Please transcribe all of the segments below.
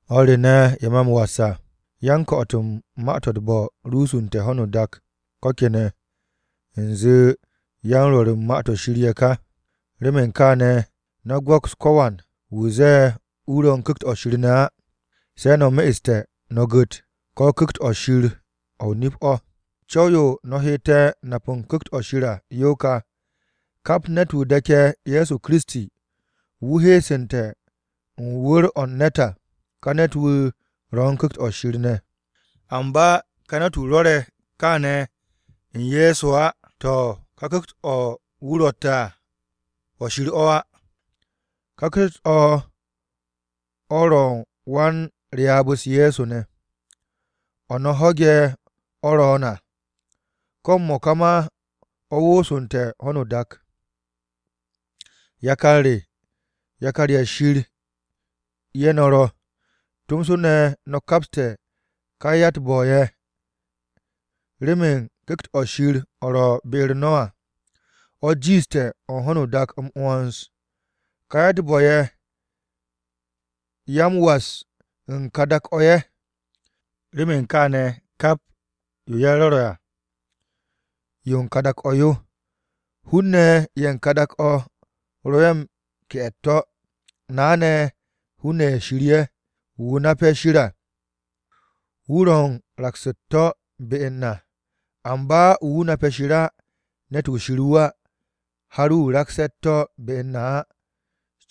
O̱r re ne̱, ye̱ me̱ m-was à, yan-ko̱'o̱t u̱n ma-to̱ u̱t-bo̱ rusunte̱ ho̱no o-dak ko̱ kene̱ u̱nze yan-rwo̱r u̱n Ma-to̱ Shir ye̱ ka. Remen kaane̱, no̱ go̱ks ko̱wan wu̱ zee wu̱ ro̱ u̱n Ku̱kt-o̱ Shir ne̱ á. Se̱ no̱ me'este̱, no̱ gu̱t, ko̱ Ku̱kt-o̱ Shir o̱ nip o̱. Co̱w-yo no̱ hette̱ nap u̱n u̱n Ku̱kt-o̱ Shir à, yo ka. Kap ne̱t-wu̱ de̱ke̱ Ye̱so Kiristi, wu̱ heesu̱nte̱ u̱n wu̱r-o̱ u̱n ne̱t à, ka ne̱t-wu̱ ro̱ u̱n Ku̱kt-o Shir ne̱. Amba ka ne̱t-wu̱ rwo̱re̱ kaane̱ u̱n Ye̱so á, to̱ ka ku̱kt-o wu̱ rotte̱ à o̱ Shir o̱ á. Ka ku̱kt-o̱ ro̱ u̱n wan-Ryaab-u̱s Ye̱so ne̱, o̱ no̱ ho̱ge̱ o̱ ro̱o̱n à, ko̱ m-mo̱ka ma o̱ woosu̱nte̱ u̱n ho̱no o-dak. Yakar re, yakar-ye̱ Shir ye̱ no̱ ro̱. Tomso ne̱ no̱ kapste̱ ka ya-u̱t-bo̱-ye̱ remen Ku̱kt-o̱ Shir o̱ ro̱ be-u̱r no̱ à, o̱ jiishte̱ o̱ u̱n ho̱no o-dak m-'wo̱ns. Ka ya-u̱t-bo̱-ye̱, ya u̱n m-was u̱n ka dak-o̱ ye̱, remen kaane̱ kap yo ye̱ rwo̱re̱ à, yo u̱n ka dak-o̱ yo, hun-ne̱ ye̱ u̱n ka dak-o̱ ro̱ ye̱ m-ke'e̱ u̱t-to̱. Na ne̱, hun-ne̱ ye̱ Shir-ye̱. Wu̱ nape̱ Shir à, wu̱ ro̱ u̱n raks u̱t-to̱ be u̱n na. Amba wu̱ nape̱ Shir á, ne̱t-wu̱ Shir wu̱ á, har wu̱ rakste̱ u̱t-to̱ be u̱n na á.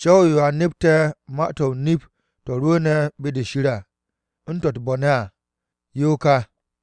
Co̱w-yo a nepte̱ ma-to̱ o-nip to̱ rwu̱u̱ne̱ be-de Shir à, u̱n to̱ u̱t-bo̱ ne̱ à, yo ka.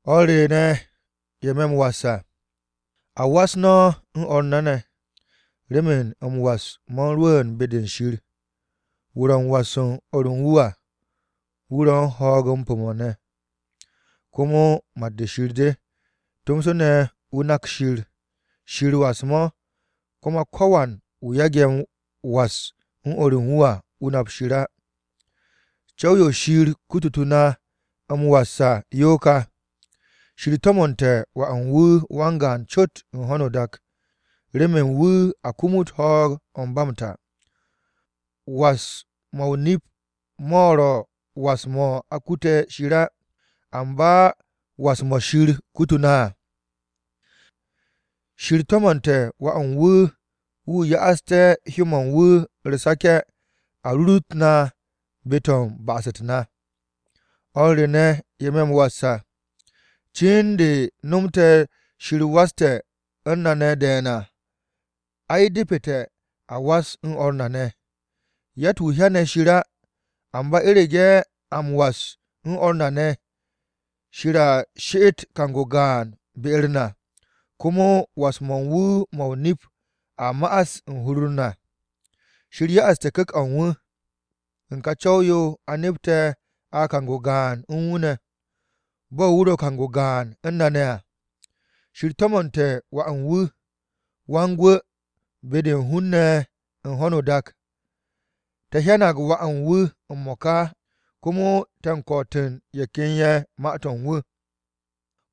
O̱r re ne̱ ye̱ me̱ m-was à, a was no̱ o̱r na ne̱, remen m-was mo̱ u̱n rwu̱u̱n be-de Shir. Wu̱ ro̱ m-was u̱n o̱r u̱n wu̱ à, wu̱ ro̱ u̱n ho̱o̱g-m pu̱-mo̱ ne̱, komo mat-de Shir de, tomso ne̱ wu̱ nak Shir. Shir was-mo̱, komo ko̱wan wu̱ yage̱ was u̱n o̱r u̱n wu̱ à, wu̱ nap Shir á. Co̱w-yo Shir kututu̱ na m-was à, yo ka, Shir to̱mo̱nte̱ Wà u̱n wu̱ wan-gaan co̱t u̱n ho̱no o-dak, remen wu̱ a kumut ho̱o̱g-o̱ ba m-ta. Was-mo̱ o-nip mo̱ ro̱ was-mo̱ a kute̱ Shir á, amba was-mo̱ Shir kutu̱ na à. Shir to̱mo̱nte̱ Wà u̱n wu̱ remen wu̱ ya'aste̱ hyó-mo̱ u̱n wu̱ u̱r-sake̱ a rurut na be-to̱ u̱n ba'as-u̱t na. O̱r re ne̱, ye̱ me̱ m-was à, cin de nomte̱ Shir waste̱ u̱n na ne̱ de̱e̱n à, ai, depete̱, a was no̱ o̱r na ne̱. Yatt-wu̱ hyane̱ Shir á. Amba u̱rege̱ a m-was u̱n o̱r na ne̱, Shir a she'et kang-o gaan be-u̱r na, komo was-mo̱ u̱n wu̱ mo̱ o-nip a ma'as u̱n hur-u̱r na. Shir ya'aste̱ Ku̱kt-o̱ u̱n wu̱, u̱n ka co̱w-yo a nepte̱ a kang-o gaan u̱n wu̱ ne̱, bo̱ wu̱ ro̱ kang-o gaan u̱n na ne̱ à. Shir to̱mo̱nte̱ Wà u̱n wu̱, Wan-Gwu̱ be-de u̱n hun-ne̱ u̱n ho̱no o-dak. Te̱ hyanag Wà u̱n wu̱ m-mo̱ka komo te̱ u̱n ko̱'o̱te̱ u̱n ye̱ ken ma-to̱ u̱n wu̱.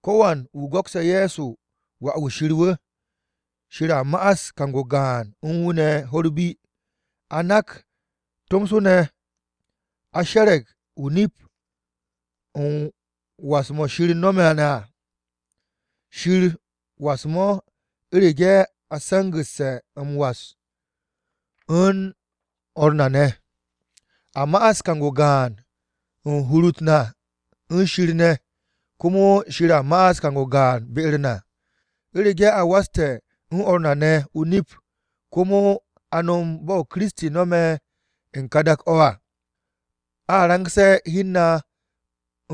Ko̱wan wu̱ go̱kse̱ Ye̱so Wà-wu̱ Shir wu̱, Shir a ma'as kang-o gaan u̱n wu̱ ne̱ ho̱-u̱r bi. A nak, tomso ne̱ a she̱re̱g o-nip u̱n was-mo̱ Shir no̱me̱ na à. Shir was-mo̱ u̱rege̱ a se̱ngu̱te̱ m-was u̱n o̱r na ne̱, a ma'as kang-o gaan u̱n hur-u̱t na u̱n Shir ne̱, komo Shir a ma'as kang-o gaan be-u̱r na. U̱rege̱ a waste̱ u̱n o̱r na ne̱ o-nip, komo a no̱m bo̱ Kiristi no̱me̱ u̱n ka dak-o̱ à, a rangse̱ hi u̱n na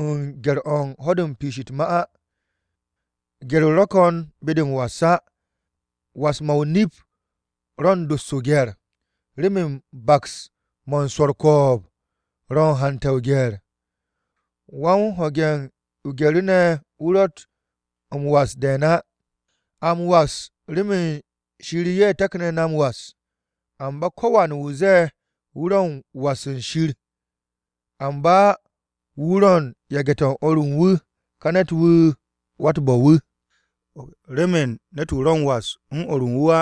u̱n gye̱r-o̱ u̱n ho̱-de u̱n piish u̱t-ma á. Gye̱r-o ro̱ ko̱n be-de m-was á. Was-mo̱ o-nip ro̱ u̱n dos o-gye̱r, remen baks mo̱ u̱n swo̱ u̱r-ko̱o̱b ro̱ u̱n hante̱ o-gye̱r. Wan-ho̱ge̱ o-gye̱ru̱ ne̱, wu̱ ro̱tt m-was de̱e̱n á. A m-was remen Shir ye̱ taknu̱ na m-was. Amba ko̱wan wu̱ zee wu̱ ro̱ u̱n m-was u̱n Shir, amba wu̱ ro̱ u̱n yage̱-u̱t o̱r u̱n wu̱, ka ne̱t-wu̱ wa-u̱t-bo̱-wu̱. Remen ne̱t-wu̱ ro̱ m-was u̱n o̱r u̱n wu̱ á,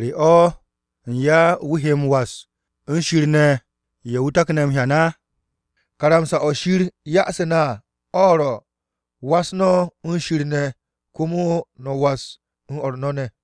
¿re o̱ u̱n ya wu̱ he m-was u̱n Shir ne̱, ye̱ wu̱ take̱ m-hyan? Karamsa-o̱ Shir ya'asu̱ na à o̱ ro̱, “Was no̱ u̱n Shir ne̱ komo no̱ was o̱r no̱ ne̱.”